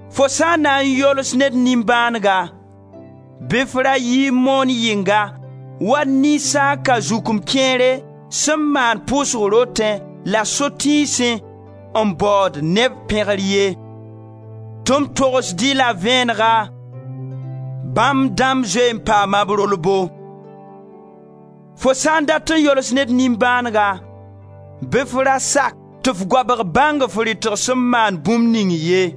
Fo sã n na n yols ned nimbãanega bɩ f ra yi n moon yɩnga wa ninsaan-kazukem kẽere sẽn maand pʋʋsg rotẽ la sotiisẽ n baood neb pẽgr ye, tɩ m togsd-y la vẽenega, bãmb dãmb zoe n paama b rolbo. Fo sã n dat n yols ned nimbãanega bɩ f ra sak tɩ f goabg bãng f rɩtg sẽn maand bũmb ning ye.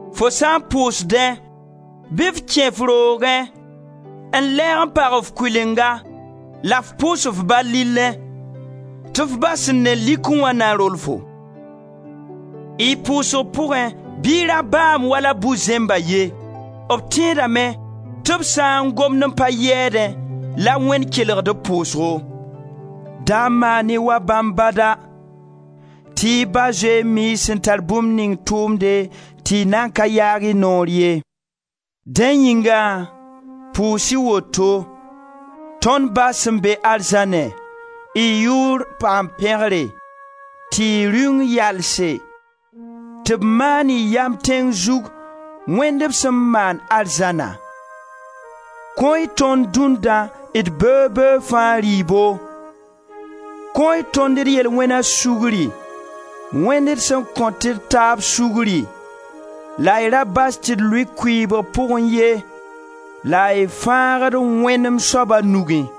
Fo sã n pʋʋsdẽ bɩ f kẽ f roogẽ n lɛɛg n pag f kʋɩlenga la f pʋʋs f Ba, lillẽ, tɩ f Ba sẽn ne likẽ wã na rol-fo. Y pʋʋsg pʋgẽ bɩ y ra baam wala bu-zẽmba ye; b tẽedame tɩ b sã n gomd n pa yɛɛdẽ la Wẽnd kelgd b pʋʋsgo. Da maan-y wa bãmb bada, tɩ y Ba zoe n mii y sẽn tar bũmb ning tʋʋmde tɩ y nan ka yaag y noor ye. Dẽ yĩngã pʋʋs-y woto: ‹Tõnd Ba sẽn be arzãnẽ, y yʋʋr paam pẽgre, tɩ y Rĩung yalse, tɩ b maan y yam tẽng zug, wẽnd b sẽn maand arzãna. Kõ-y tõnd dũnna d beoog-beoog fãa rɩɩbo. Kõ-y tõnd d yel-wẽna sugri wẽnd d sẽn kõt d taab sugri, la y ra bas tɩ d lʋɩ kʋɩɩbg pʋgẽ ye la y fãgd-d wẽnem soaba nugẽ.›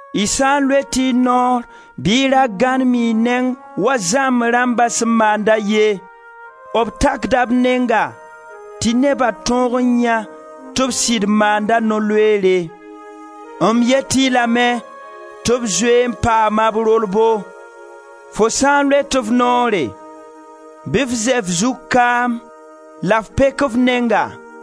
Y sã n loet y noor bɩ y ra gãnem y neng wa zãmb rãmba sẽn maanda ye; b takda b nenga tɩ neba tõog n yãe tɩ b sɩd maanda no-loeere. M yet-y lame tɩ b zoe n paama b rolbo. Fo sã n loet f noore bɩ f zɛ f zug kaam la f pek f nenga,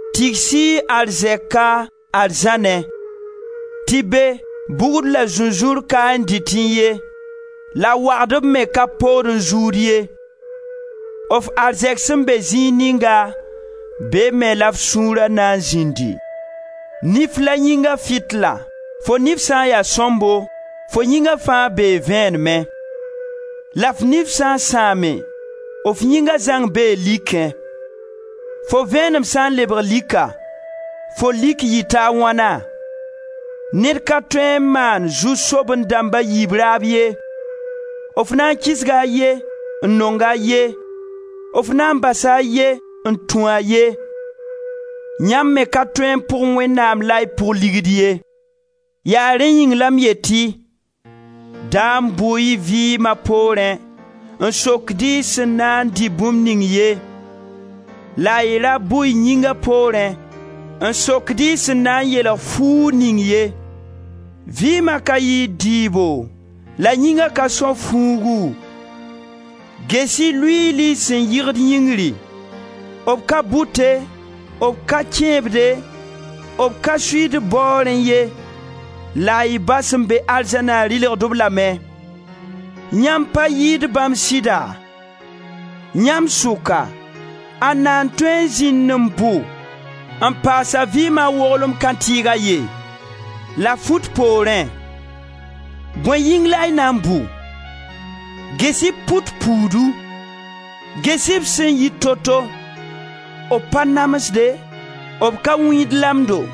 Tigs-y y arzɛka arzãnẽ, tɩ be, bugd la zũnzũur ka n dɩtẽ ye la wagdb me ka pood n zuud ye. F arzɛk sẽn be zĩig ninga, be me la f sũura na n zĩndi. Nif la yĩnga fitila. Fo nif sã n ya sõmbo, fo yĩnga fãa bee vẽenemẽ. La f nif sã n sãame, f yĩnga zãng bee likẽ. Fo vẽenem sã n lebg lika, fo lik yɩta a wãna? Ned ka tõe n maan zu-soaben-dãmb a yiib raab ye, f na kisga a ye, n nong a ye, f na n basa a ye n tũ a ye. Yãmb me ka tõe n pʋg Wẽnnaam la y pʋg Ligd ye. Yaa rẽ yĩng la m yet-y: da bʋ-y y vɩɩma poorẽ, n sokd-y y sẽn na n dɩ bũmb ning ye; la y ra bʋ y yĩnga poorẽ n sokd-y y sẽn na n yeelg fuug ning ye. Vɩɩma ka yɩɩd dɩɩbo la yĩnga ka são fuugu? Ges-y luiili sẽn yɩgd yĩngri: b ka bʋte, b ka kẽebde, b ka suiid baoorẽ ye, la y Ba sẽn be arzãna dɩlgd-b lame. Yãmb pa yɩɩd bãmb sɩda? Yãmb sʋka ãnda n tõe n zĩnd n bʋ n paas a vɩɩma woglem kãntɩɩg a ye? La fut poorẽ, bõe yĩng la y na n bʋ? Ges-y pʋt puudu: ges-y b sẽn yit toto, b pa namsde, b ka wĩid lamdo.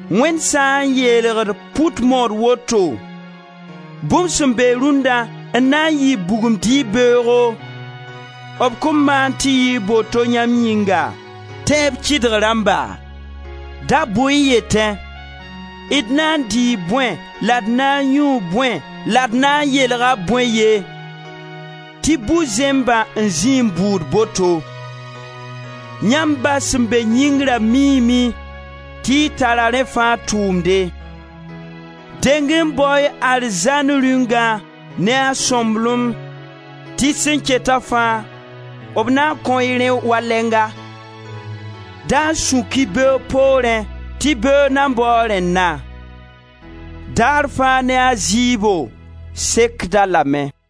Wẽnd sã n yeelgd pʋt mood woto, bũmb sẽn be rũnna n na n yɩ bugum dɩɩb beoogo, b kõn maan tɩ yɩɩg boto yãmb yĩnga, tẽeb kɩdg rãmba? Da bʋ-y n yetẽ: d na n dɩɩ bõe la d na n yũu bõe la d na n yeelga bõe ye, tɩ bu-zẽmbã n zĩi n bʋʋd boto. Yãmb Ba sẽn be yĩngrã miime tɩ y tara rẽ fãa tʋʋmde. Deng-y n bao-y arzãn Rĩungã ne a sõmblem tɩ sẽn keta fãa b na kõ-y rẽ wa lɛnga. Da sũk-y beoog poorẽ tɩ beoog na baoo a rẽnna. Daar fãa ne a zɩɩbo, sekd-a lame.